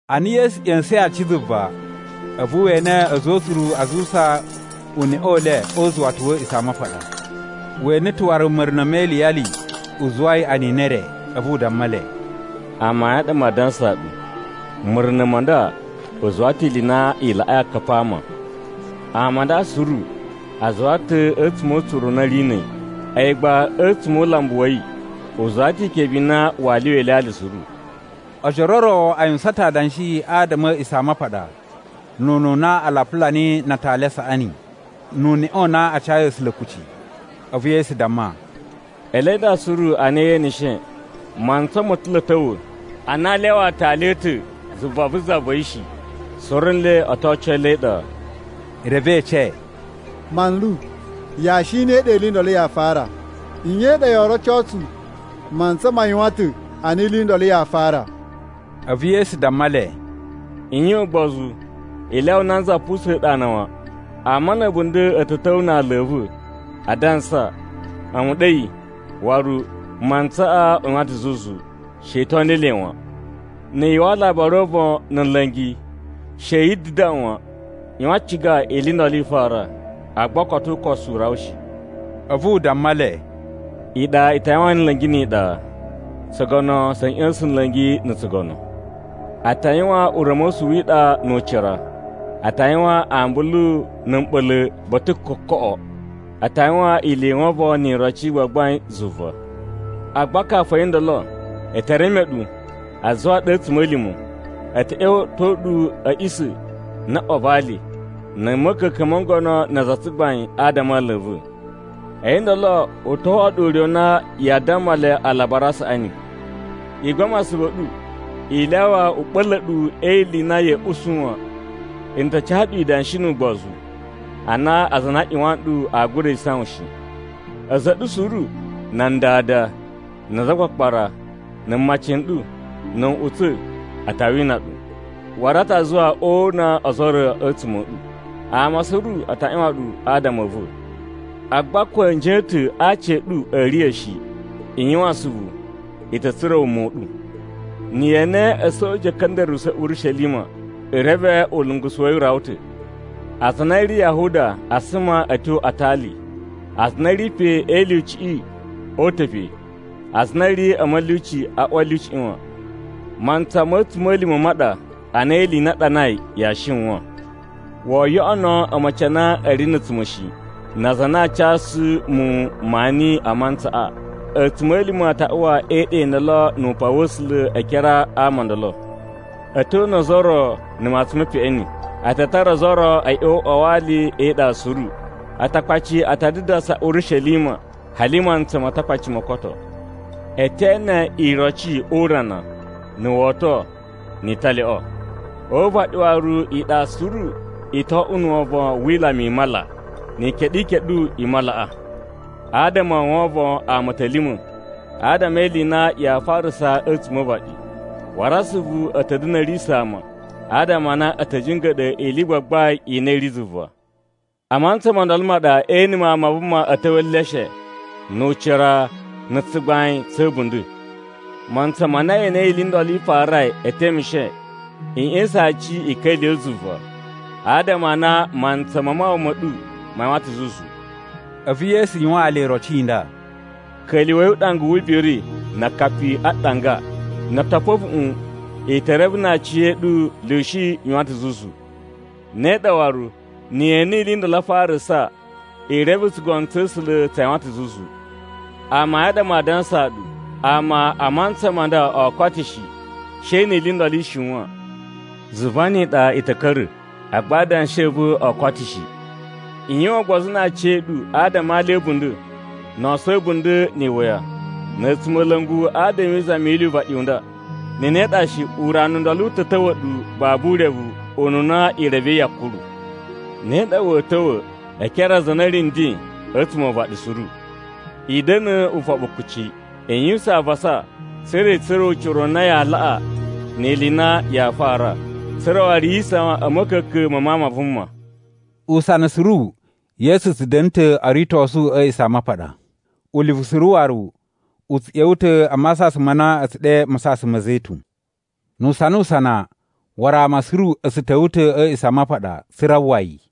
Ana Yesu ꞌya̱sa̱in aaci zuva, a̱vu we ene a̱za̱ o utsuru a zuwusa uneꞌe u le o uzuwata wa̱ A̱a̱ꞌisamapaɗa. We ene ta̱ waru ma̱runa̱ me iliyali u zuwai anini e re. A̱vu u damma le, “Amayun a ɗa maa dansaa ɗu, ma̱runa̱ ma nda u zuwa ta̱ ili i na i laꞌai akapi a ama. Ama a nda suru a zuwa ta̱ a̱tsuma̱ o utsuru u na a̱ ri na̱ a̱yi, a̱yi gba a̱tsuma̱ o ulambu wa̱ yi, u zuwa ta̱ ikebe i na waa lyuwa ilyalya suru.” Ojoro o ro a yuwusan ta̱ adanshi adama a̱ A̱a̱ꞌisamapaɗa, nu ununa a lapula niyi na atali a saꞌani, nu uneꞌe u na a cayi A̱sula̱ kucci. A̱vu Yesu damma, “Ele nda suru a na ye eneshe, mantsa mo ta̱ lo a̱ ta̱wa̱ ana aa lyawa aatali a̱ ta̱ zuva vu za va̱ yi shi, suru nle o to oco le e iɗa.” Reve e ece, “Manlu, yashi i ne i ɗa ili i ndolo yaa fara? Nye i ɗa yoo roco tsu mantsa ma yuwan ta̱ a na ili i ndolo yaa fara?” A̱vu Yesu damma le, “I yuwan ugbozu, i lyawa nanza pusa̱n ɗu ana wan. Ama na̱ a̱bunda̱ a̱ ta̱ ta̱wa̱ na aala a̱ va̱ adansa, ‘A̱mu ɗa a̱yi,’ waru, ‘Mantsaꞌa u yuwan ta̱ zuzu.’ She i toni le wan. Na̱ yu uwwa alabari o uvon na̱ nla̱ngi, she yi dadaꞌwan wan. ꞌYuwan ciga ili i ndolo i ta fara, agba koto ukosu u rawa shi.” A̱vu u damma le, “Iɗa i ta yuwan nla̱ngi ni iɗa, tsugono tsa̱ ꞌya̱sa̱n nla̱ngi na̱ tsugono. A ta yuwan ura̱mosu wi iɗa nu ucira, a ta yuwan ambulu na̱ mɓa̱la̱ ba̱ta̱ kokoꞌo. A ta yuwan ili i wovon ni iroci i gbagbain zuva. “Agba kafu a̱yi ndolo, e te reme ɗu, a zuwa ɗu a̱ a̱tsuma̱lima̱. A̱ ta̱ ꞌya̱wa̱to ɗu a̱ a̱ꞌisa̱ na̱ ꞌwa va ali, na̱ a̱ ma̱ka̱ka̱n mo ngono na aza a tsugbain adama a aala a̱ va̱. A̱yi ndolo u to oꞌwo ɗu ure u na yaa damma le Alabari a Saꞌani. I gbama asuvu a̱ ɗu i lyawa u ɓa̱la̱ ɗu e ili i na ya̱a̱ usu wan. N ta ca ɗu idanshi nu ugbozu, a na aza a na a ꞌyuwan nɗu aa gura isawan shi. A̱za̱ a̱ ɗu suru: nan dada, na azakpakpara, na̱ mmaci n ɗu, na̱ nꞌutsa̱, a ta wina ɗu. Waru a ta zuwa o una ozo o ro a̱tsuma̱ a̱ ɗu. Ama suru a ta ꞌyuwan ɗu adama a̱ va̱. Agba ko a̱nji a̱ ta̱ a aci a̱ ɗu a̱a̱ riya̱ shi. I yuwan asuvu, i ta̱ tsura̱ wuma u ɗu. “Na̱ ye ene a̱soja a̱ ka̱nda̱ruwa̱ Urishelima, i reve ulungusu wa̱ yi u rawa ta̱. Aza a na a̱ ri Yahuda a suma a̱ tyo a atali. Aza a na a̱ ri pe a̱ e ilyuciꞌi o uta̱ pe. Aza a na a̱ ri a̱ mulyuci a uwa a̱ lyuciꞌi wan. Mantsa ma̱ a̱tsuma̱lima̱ ma ɗa a na ili i na a ɗanai yaa shiwan. Woo yoꞌono a̱ma̱ci a na a̱ ri na̱ a̱tsuma̱ shi, na aza a na aa casu muwun maani a mantsaꞌa! A̱tsuma̱lima̱ a ta uwa e iɗa i ndolo nu upan wa̱ A̱sula̱ e ekere a ama o ndolo. A̱ to una ozo o ro na̱ matsun me peꞌeni, a ta tara ozo o ro a̱ ꞌya̱wa̱ o uꞌwa wa ali e iɗa suru. Atakpaci a ta dadasa Urishelima hali mantsa ma Atakpaci mo koto. “E te ene iroci o urana, na̱ woto, ni italyoꞌo. O uvaɗi waru iɗa suru u to oꞌwo na̱ wovon wi ilama i mala, ni ikeɗu ikeɗu i malaꞌa. Adama o wovon ama a̱ ta̱ lima̱, adama e ili i na yaa farasa a̱tsuma̱ o uvaɗi. Waru asuvu a̱ ta̱ da̱na̱ a̱ riya̱sa̱ ama, adama a na a̱ ta̱ jinga̱ɗa̱ ili i gbagbain i na i ri zuva. A mantsa mo ndolo ma ɗa ee ene Mawun ma Vuma a̱ ta̱wa̱ e eleshe, nu ucira, na̱ tsugbain tsa̱ a̱bunda̱. Mantsa ma na ili i ndolo i farai e temeshe, i ꞌya̱sa̱n aci i ka̱lyuwa̱ zuva, adama a na mantsa ma mawawa ma̱ ɗu ma yuwan ta̱ zuzu.” A̱vu Yesu yuwaan le iroci i nda: “Ka̱lyuwa̱i uɗanga wu ubiri na akapi a ɗanga. No o topo a̱vuꞌun, i te reve na aciya̱ɗu lyushi yuwan ta̱ zuzu. Ne ɗa waru, na̱ ye ene ili i ndolo a farasa, i reve tsugono tsa̱ A̱sula̱ tsa yuwan ta̱ zuzu. “Amayun a ɗa maa dansaa ɗu, ama a mantsa ma nda oo koto shi, she ni ili i ndolo i shiwan. Zuva ni iɗa i ta̱ ka̱ra̱, agba adanshi a̱ va̱ oo koto shi. “I yuwan ugbozu na aciya̱ɗu adama a alya a̱ a̱bunda̱, no oso a̱ a̱bunda̱ ni iwuya, na̱ a̱tsumola̱ngu adama e izami yi ili yu uvaɗi u nda. Na̱ ne ɗa shi, urana u ndolo u ta̱ ta̱wa̱ ɗu babu urevu ununa i revei yakuru. Ne ɗa wa̱a̱ ta̱wa̱ e ekere a aza a na a̱ ri nden a̱tsuma̱ o uvaɗi suru. I da̱na̱ ufoɓu kuci. I yuwusan avasa tsa̱ra̱ i tsura̱ ucira u na yaa laꞌa ni ili i na yaa fara, tsa̱ra̱ waru yi isawan a̱ ma̱ka̱ka̱n ma Mawun ma Vuma.” Usana suru Yesu tsu da̱na̱ ta̱ o ritosu a̱ A̱a̱ꞌisamapaɗa. Ulivu suru waru, u tsu ꞌya̱wa̱ ta̱ a masasan ma na a̱ tsu ɗe Masasan ma̱ Zetun. Nu usanusana, waru ama suru a̱ tsu ta̱wa̱ ta̱ a̱ A̱a̱ꞌisamapaɗa, tsa̱ra̱ a uwwa yi.